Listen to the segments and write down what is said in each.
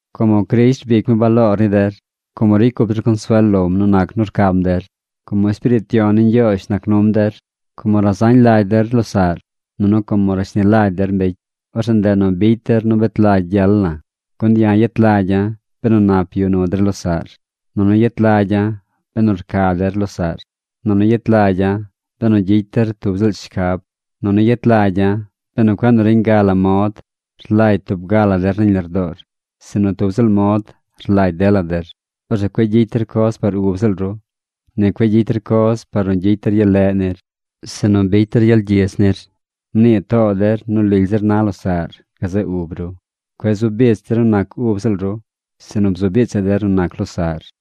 Como Crisht rbic mi baloor ni der, como ricy cup der consuel lom nu nac nu rcam der, como Espiriit Yon ni Ñgyoozh nac num der, como razañ lagy der losaꞌr, nunu como rashni lagy der mbecy, orzeꞌ ndeꞌ nu bicy der nu bet lagy gyel la̱. Gun ya̱ yet lagya̱ benu nap yuꞌ nu der losaꞌr. Nunu yet lagya̱ benu rca der losaꞌr. Nunu yet lagya̱ benu gyicy der tub ziꞌl shcab. Nunu yet lagya̱ benu cueꞌ nu reñ ga la mod rlagy tub ga la der nañ lardoor, sinu tub ziꞌl mod rlagy dela der. Orzeꞌ cueꞌ gyicy der coz par ub ziꞌl ru. Ni cueꞌ gyicy der coz par nu gyicy der gyel leꞌ nir, sinu gyicy der gyel gyidz nir. Mnii too der nu lily zir na losaꞌr gazeꞌ ub ru. Cueꞌ zu bich der nu nac ub ziꞌl ru, sinu bzu bichaꞌ der nu nac losaꞌr.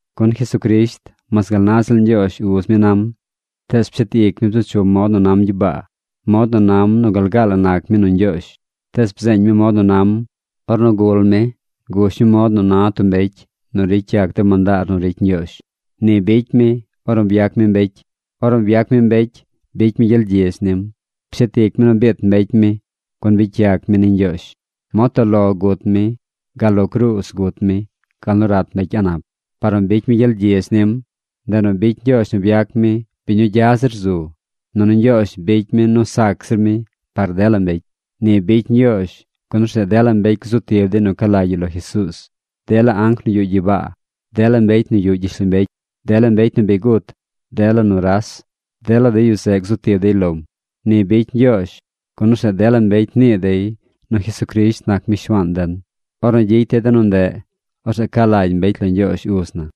Gun Jesucrisht, mas gal naꞌ ziꞌl Ñgyoozh Uz mi nam, tees pshet ic mi bzu chum mod nu nam gyibaa. Mod nu nam nu gal gaa la nac mi nu Ñgyoozh. Tees bzeeñ mi mod nu nam. Ornu gul mi, gush mi mod nu na tub mbecy nu ricy yac de mandaar nu ricy Ñgyoozh. Ni bicy mi ornu byac mi mbecy. Ornu byac mi mbecy, bicy mi gyel gyidz nim. Pshet ic mi nu biit mbecy mi, gun bicy yac mi ni Ñgyoozh. Mod toꞌ lo gut mi. Gal lo cruuz gut mi, gal nu rat mbecy a̱ꞌ nap. Par nu bicy mi gyel gyidz nim, ndeꞌ nu bicy Ñgyoozh nu byac mi biñ nu gya zir zu, nunu Ñgyoozh bicy mi nu sac zir mi par dela mbecy. Ni bicy Ñgyoozh, gun orzeꞌ dela mbecy gzu tib dey nu ca lagy yu lo Jesuuz. Dela anc nu yuꞌ gyibaa, dela mbecy nu yuꞌ gyishlombecy, dela mbecy nu bi gut, dela nuras, dela de yu zeꞌ gzu tib dey lom. Ni bicy Ñgyoozh, gun orzeꞌ dela mbecy nii dey nu Jesucrisht nac mi Shuaan den. Ornu gyicy dey de nu ndeꞌ, orzeꞌ ca lagy mbecy lo Ñgyoozh Uz na.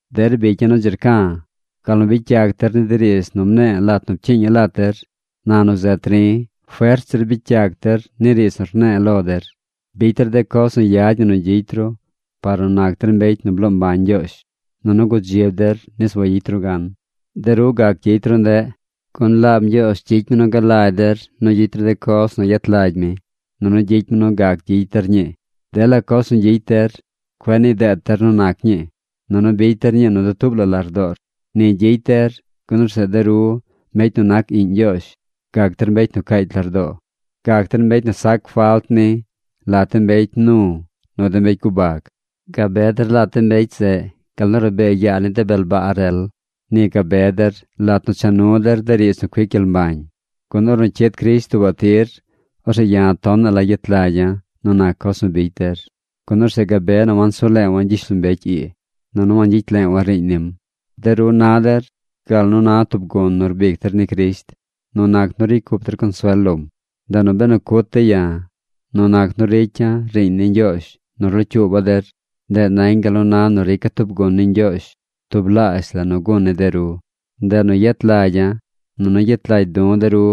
Der bicya̱ nu dzi rca̱, gal nu bicy yac der ni de riidz nu mne̱e̱ lat nu pcyiiña̱ lat der, na nu zet ri̱, fert zir bicy yac der ni riidz nu rne̱e̱ lo der. Bicy der de coz nu yad ñi nu gyicy ru par nu nac der mbecy nu bloo mbañ Ñgyoozh. Nunu gudzib der nis wayicy ru gan. De ru gac gyicy ru ndeꞌ, gun laab Ñgyoozh gyicy mi nu galagy der nu gyicy ru coz nu yet lagy mi, nunu gyicy mi nu gac gyicy der ñii. Dela coz nu gyicy der, cueꞌ nii deet der nu nac ñii, nunu bicy der ñii nu dutuub la lardoor. Ni gyicy der, gun orzeꞌ de ru, mbecy nu nac iꞌñ Ñgyoozh, gac der mbecy caacy lardoo. Gac der mbecy nu sac falt ni lat de mbecy mnu nu de mbecy gubag. Gabe der lat de mbecy zeꞌ gal nu rabee yaa ni de bel baa rel. lat nu cha nu der de riidz nu cuic gyel mbañ, gun ornu cyid Crisht tuubaꞌ tir, orzeꞌ ya̱ tonaꞌ la gyet lagya̱ nu nac coz nu bicy der, gun orzeꞌ gabe nu wansu leewa̱ gyishlombecy ii, nunu wangyicy leewa̱ riiñ nim. De ru na der gal nu na tub gun nu rbic der ni Crisht nu nac nu ricy cup der consuel lom. Ndeꞌ nu benu cut dey ya̱ nu nac nu ricy ya̱ riiñ ni Ñgyoozh nu rlocyuuba̱ der, ndeꞌ nañ gal na nu rica̱ tub gun ni Ñgyoozh tublaazh la nu gun ni de ru. Ndeꞌ nu yet lagya̱, nunu gyet lagy du̱ de ru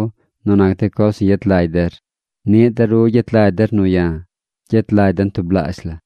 nu nac de coz nu yet lagy der. Niꞌ de ru gyet lagy der nu ya̱. Gyet lagy den tublaazh la.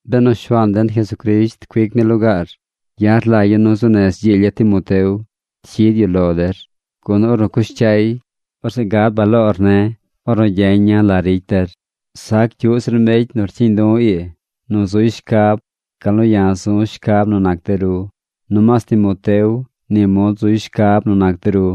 Benu Shuaan den Jesucrisht cuic mi lugaar, ya̱ rlagya̱ nu zuu nez gyiilya̱ Timoteo cyid yu lo der, gun ornu cush cyay, orzeꞌ gad baloor ne̱ ornu gyeña̱ la ricy der. Sac cyuꞌ zir mbecy nu rcyiiñ du̱ ii nu zuy shcab gal nu ya̱ zu̱ shcab nu nac de ru. Nomaas Timoteo ni mod zuy shcab nu nac de ru.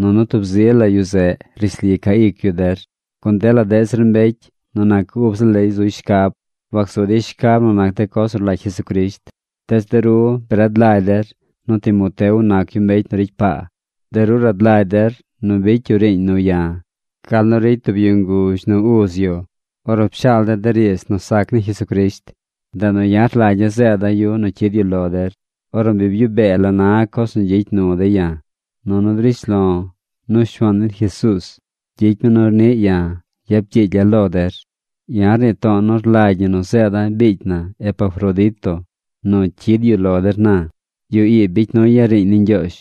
Nunu tub zi la yu zeꞌ rishli ca ic yu der. Gun dela deꞌ zir mbecy nu nac ub ziꞌl dey zuy shcab. Wacsu dey shcab nu nac de coz nu rlagy Jesucrisht. Tees de ru bi rad lagy der nu Timoteo nac yu mbecy nu ricy paa. De ru rad lagy der nu bicy yu riiñ nu ya̱ gal nu ricy tub yu nguzh nu uz yu ornu pshaal de̱ de riidz nu sac ni Jesucrisht. Ndeꞌ nu ya̱ rlagya̱ zeeda̱ yu nu cyid yu lo der ornu bi byuꞌ bee la na coz nu gyicy nu dey ya̱. Nunu drish lo̱ nu Shuaan den Jesuuz gyicy mi nu niꞌ ya̱ yap gyiilya̱ lo der. Ya̱ rnii to̱o̱ nu rlagy ñi nu zeeda̱ biicy na Epafrodito nu cyid yu lo der na. Yu ii bicy nuy ya̱ riiñ ni Ñgyoozh,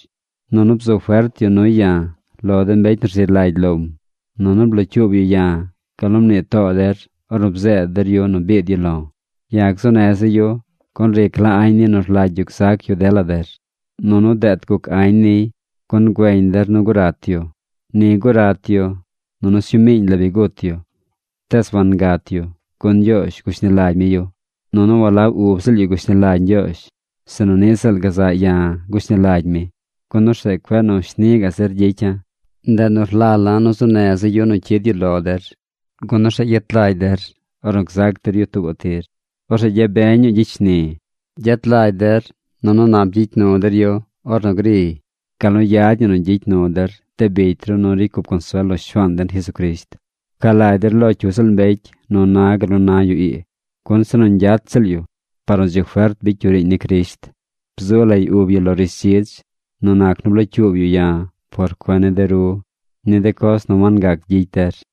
nunu bzu fert yu nuy ya̱ lo de mbecy nu rzi lagy lom. Nunu blocyuub yu ya̱ gal nu mnii too der ornu bzeed der yu nu biid yu lo̱. Ya̱ gzuu neza̱ yu, gun ric la añ niy nu rlagy yu gzac yu dela der. Nunu deet guc añ niy, gun güeñ der nu gurat yu. Ni gurat yu, nunu sñuu miiñ la bi gut yu. Tees wangat yu, gun Ñgyoozh gushni lagy mi yu. Nunu walab ub ziꞌl yu gushni lagy Ñgyoozh, sinu niꞌ ziꞌl gazaꞌ ya̱ gushni lagy mi, gun orzeꞌ cueꞌ nu shni gaꞌ zir gyicya̱. Ndeꞌ nu rlala̱ nu zuu neza̱ yu nu cyid yu lo der, gun orzeꞌ gyet lagy der ornu gzac der yu tuubaꞌ tir. Orzeꞌ gyabeñ ñuu gyicy shni̱. Gyet lagy der nunu nap gyicy nu der yu ornu griy, gal nu yad ñi nu gyicy nu der de bicy ru nu ricy cup consuel lo Shuaan den Jesucrisht. Pca lagy der lo cyu ziꞌl mbecy nu na gal nu na yu ii, gun se nu ñgyat ziꞌl yu par nu dzi fert bicy yu riiñ ni Crisht. Bzu lay ub yu lo rishdzidz, nu nac nu blocyuub yu ya̱ por cuen ni de ru ni de coz nu wangac gyicy der.